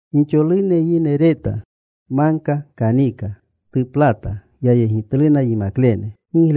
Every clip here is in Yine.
Gixolune yine reta. Magka kanika. Tuplata. Yayegitluna yimaklene.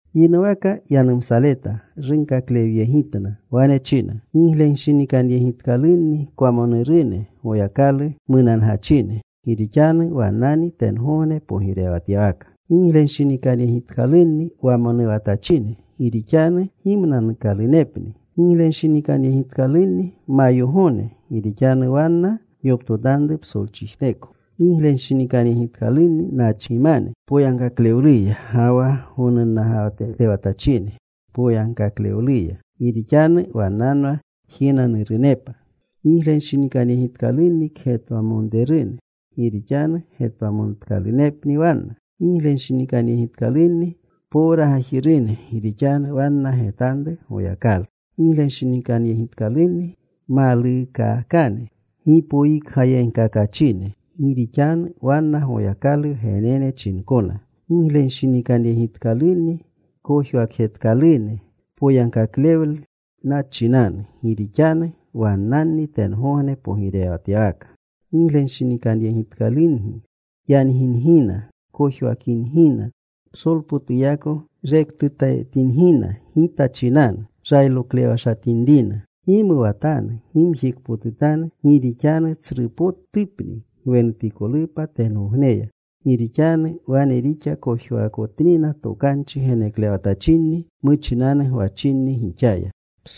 Yinuwaka yanumsaleta. Runkaklewyegitna. Wane china: Giglenshinikanyegitkalunni kwamonurune Goyakalu munangachine, gi rixanu wannani tengogne pogirewatyawaka. Giglenshinikanyegitkalunni wamonuwatachine, gi rixanu gimnanuukalunepni. Giglenshinikanyegitkalunni mayogone, gi rixanu wanna yoptotanru psolchijneko. Giglenshinikanyegitkalunni nachgimane poyagkaklewluya, ga wa gonunnagatewatachine poyagkaklewluya, gi rixanu wannanwa jinanurunepa. Giglenshinikanyegitkalunni kgetwamonrerune gi rixanu getwamonutkalunepni wanna. Giglenshinikanyegitkalunni powragajirune, gi rixanu wanna getanru Goyakalu. Giglenshinikanyegitkalunni maluukakane gipoyikgayegkakachine, gi rixanu wanna Goyakalu wgenene chinkona. Giglenshinikanyegitkalunni kojwakjetkalune poyagkaklewlena chinanu, gi rixanu wannanni tengogne pogirewatyawaka. “Giglenshinikanyegitkalungi yangingina, kojwakingina, psolpotuyako rektutetingina Gita chinanu, rayloklewashatinrina. Gimuwatanu. Gimjikpotutanu, gi rixanu tsrupotupni gwenutikolupa tengogneya, gi rixanu wane rixa kojwaakotnina tokanchi geneklewatachinni muchinanu gwachinni gixaya.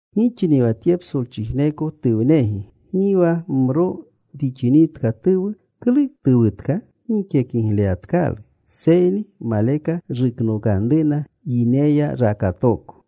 “Gixni wa tye psolchijneko tuwnegi. Gi wa mro rixinitka tuwu, ¿klu tuwutka? Gike kigleyatkalu, seyni maleka ruknokanruna yineya rakatooko.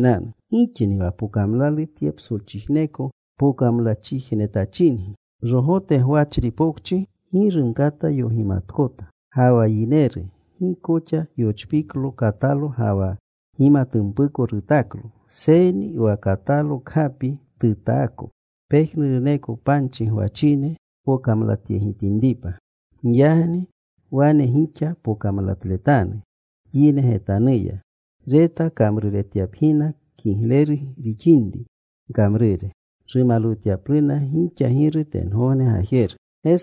“Gixni wa pokamlalu tye psolchijneko pokamlachijnetachingi. Magka rogote gwachri pokchi gi rumkata yogimatkota. Ga wa yineru gikoxa yochpiklo katalo ga wa gimatumpuko rutaklo, seyni wa katalo kgapi tutaako, pejnuruneko panchi gwachine tpokamlatyegitinripa. Giyagni wane gixa pokamlatletanu yine getanuya, reta kamruretyapgina kigleru rixinri gkamrure, rumalwutyapluna gixa Giru tengogne Gajeru.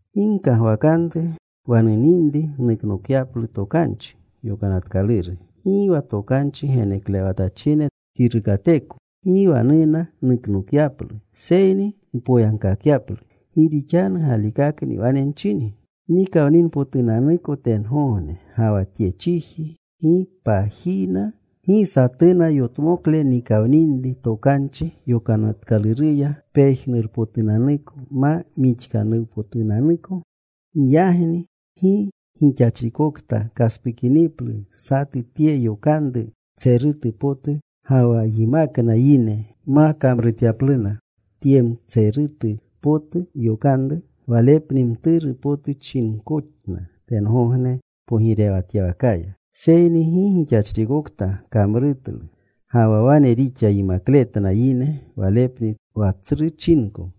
“Gi gkagwakanru wa nuninri nuknokapyaplu Tokanchi Yokanatkaluru, gi wa tokanchi geneklewatachine kirukateko. Gi wa nuna nuknokyaplu, seyni npoyagkakyaplu. Gi rixanu galikakni wane nchingi, Nikawninpotunanuko tengogne ga wa tye chiji, gi pajina, gi satuna yotmokle nikawninri Tokanchi Yokanatkaluruya, pejnurpotunanuko ma mixkanuwpotunanuko. Giyagni gi gixachrikokta kaspukiniplu satu tye yokanru mtserutu potu ga wa yimakna yine ma kamrutyanupluna tye mtserutu potu yokanru, walepni mturu potu chinkona tengogne pogirewatyawakaya. Seyni gi gixachrikokta kamrutlu ga wa wane rixa yimakletna yine, walepni wa tsru chinko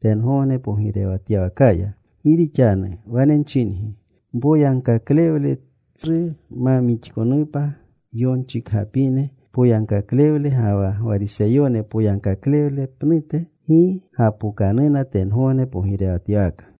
tengogne pogirewatyawakaya. Gi rixanu wane nchingi, mpoyagkaklewle tsru ma mixkanupa yonchikgapine poyagkaklewle ga wa Gwariseyone poyagkaklewle pnute, gi gapokanuna tengogne pogirewatyawaka.”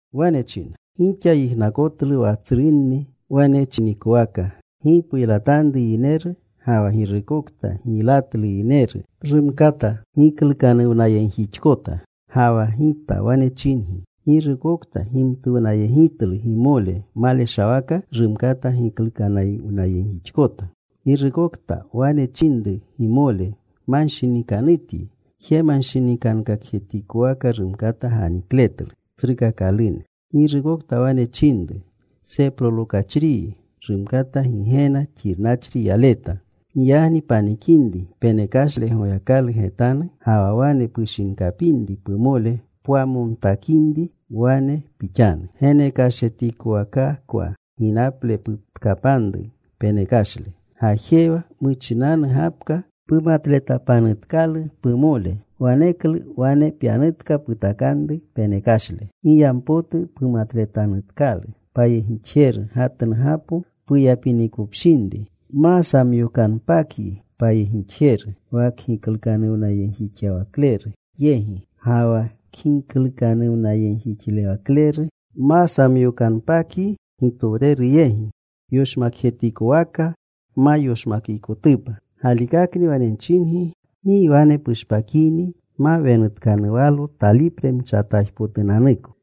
Wane china, “Gixa yijnakotlu wa tsrunni wane chinikowaka, ‘Gi puylatanru yineru,’ ga wa ‘Girukokta giylatlu yineru rumkata giklukanuwnayegjixkota.’ Ga wa Gita wane chingi, girukokta gimtuwnayegitlu gimole maleshawaka rumkata giklukanuwnayegjixkota. Girukokta wane chininri gimole, ‘Manshinikanutyi,’ jemanshinikankakjetikowaka rumkata ganikletlu tsrukakalune. Girukokta wane chininri, ‘Seprolokachriyi,’ rumkata Gigena xirnachri yaleta. “Giyagni panikinri penekashle Goyakalu getanu, ga wa wane pushinkapinri pumole pwamontakinri, wane pixanu: Genekashjetikowakakwa ginaple putkapanru penekashle. Gajewa. Muchinanu gapka pumatletapanutkalu pumole. Waneklu wane pyanutka. Putakanru penekashle. “Giyampotu pumatletanutkalu payegixjeru gatnugapo puyapinikopshinri, ma samyookanpakyi payegixjeru wa kgiklukanuwnayegjixlewakleru yegi. Ga wa kgiklukanuwnayegjixlewakleru ma samyookanpakyi gitowereru yegi, yoshmakjetikowaka pma yoshmakikotupa. Galikakni wane nchinyi, gi wane pushpakini pma wenutkanuwalo talipre mchataajpotunanuko.”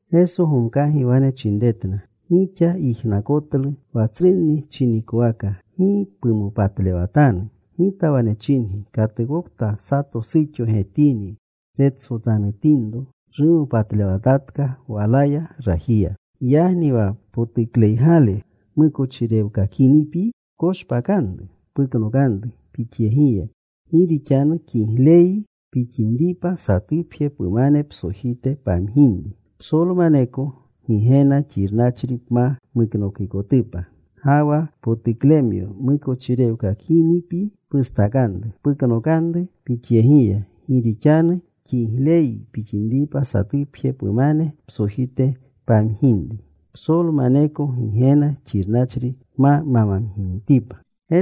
Geso gomkagi wane chinretna, “Gixa yijnakotlu wa tsrunni chinikowaka: Gi pumopatlewatanu. Gita wane chingi, katukokta sato suxo getini, retsotanutinro, rumopatlewatatka walaya rajiya. “Giyagni wa potukleygale mukochirewkakinipyi, pkoshpakanru. Puknokanru pixyegiya. Gi rixanu kigleyyi pixinripa satupje pumane psojite pamginri, psolumaneko Gigena xirnachri pma muknokikotupa. Ga wa potuklemyo mukochirewkakinipyi pustakanru. Puknokanru pixyegiya. Gi rixanu kigleyyi pixinripa satupje pumane psojite pamginri, psolmaneko Gigena xirnachri pma mamginitipa.”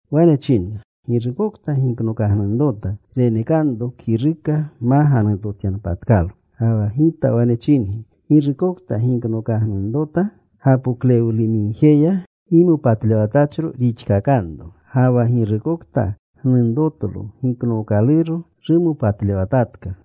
Wane chinna, “Girukokta giknokagnunrota, renekanro kiruka ma ganunrotyanpatkalo. Ga wa Gita wane chingi: Girukokta giknokagnunrota gapoklewlumigjeya, gimopatlewatachro rixkakanro. Ga wa girukokta gnunrotlo giknookaluro, rumopatlewatatka.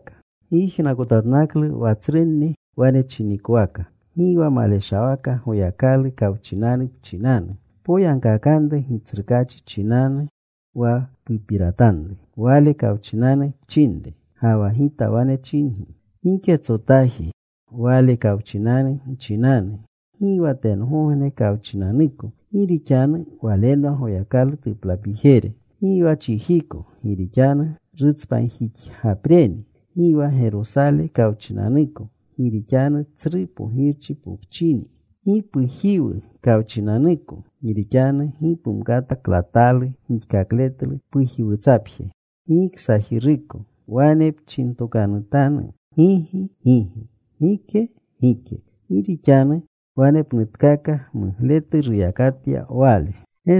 “Gyijnakotatnaklu wa tsrunni wane chinikowaka: Gi wa maleshawaka Goyakalu kawchinanu pchinanu. Poyagkakanru Gitsrukaachi chinanu, wa pupiratanru Wale kawchinanu pchinre. Ga wa Gita wane chingi, giketsotaji Wale kawchinanu nchinanu: gi wa tengogne kawchinanuko, gi rixanu walenwa Goyakalu tuplapijere; gi wa chijiko, gi rixanu rutspanjixgapreni; gi wa Gerosale kawchinanuko, gi rixanu tsru Pogirchi pokchini; gi pujiwu kawchinanuko, gi rixanu gi pumkata klatalu gixkakletlu pajiwutsapje, gi ksajiruko. Wane nchintokanutanu, gigi: ‘Gigi;’ gike: ‘Gike.’ Gi rixanu wanepnutetka mugletu ruyakatyatka wale.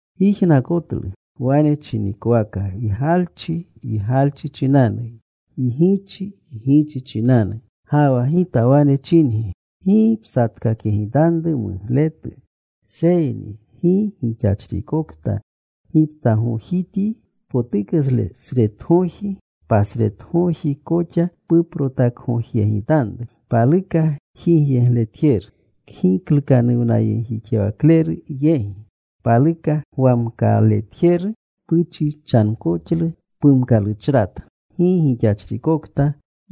“Gyijnakotlu wane chinikowaka, ‘Ygalchi, ygalchi chinanu. Ygichi, ygichi chinanu.’ Ga wa Gita wane chingi, gi psatkakyegitanru mugletu, seyni gi gixachrikokta giptagojityi potuklesretgoji, pasretgoji koxa puprotakgojyegitanru. Paluka jigyegletjeru kgiklukanuwnayegjixlewakleru yegi, paluka gwamkaletjeru puchichankoxlu pumkaluchrata. Gi gixachrikokta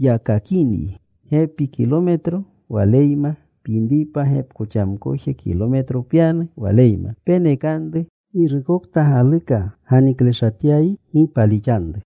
yakakinyi gepi kilometro waleyma pyinripa, gepkoxamkoje kilometro pyanu waleyma. Penekanru pagjitjeru. Girukokta galuka ganikleshatyayi, gi paalixanru.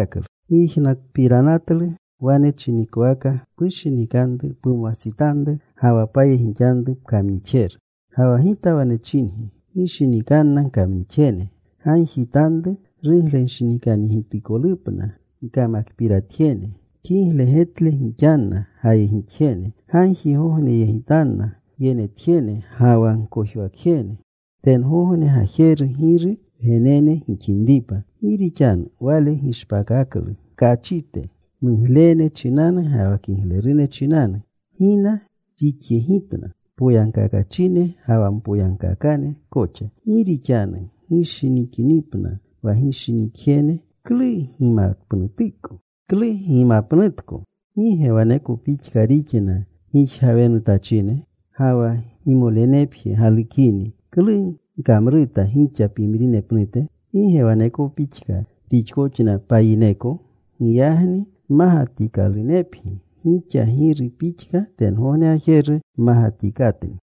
“Gyijnakpiranatlu wane chinikowaka, ‘Pushinikanru pumwastsitanru ga wa payegixanru pkamnixjeru.’ Ga wa Gita wane chingi, gishinikanna gkamnixjene. Gagjitanru ruglenshinikanyegitikolupna gkamakpirjetjene. Kigle getle gixanna gayegixjene. Gagjigogneyegitanna gyenetjene ga wa gkojwakjene, tengogne Gajeru Giru wgenene gixinripa. Gi rixanu Wale gishpakaklu tkachite muglene chinanu ga wa kiglerune chinanu. Gina rixyegitna poyagkakachine ga wa mpoyagkaakane koxa. Gi rixanu gishinikinipna wa gishinikjene, ¿klu gimapnutko? ¿Gi ge waneko pixka rixna gijgawenutachine? Ga wa gimolenepje galukini, ¿klu gkamruta gixa pimrine pnute? ¿Gi ge waneko pixka rixkoxna payineko? Giyagni mmagatikanepgi, gixa Giru pixka tengogne Gajeru mmagatikatni.”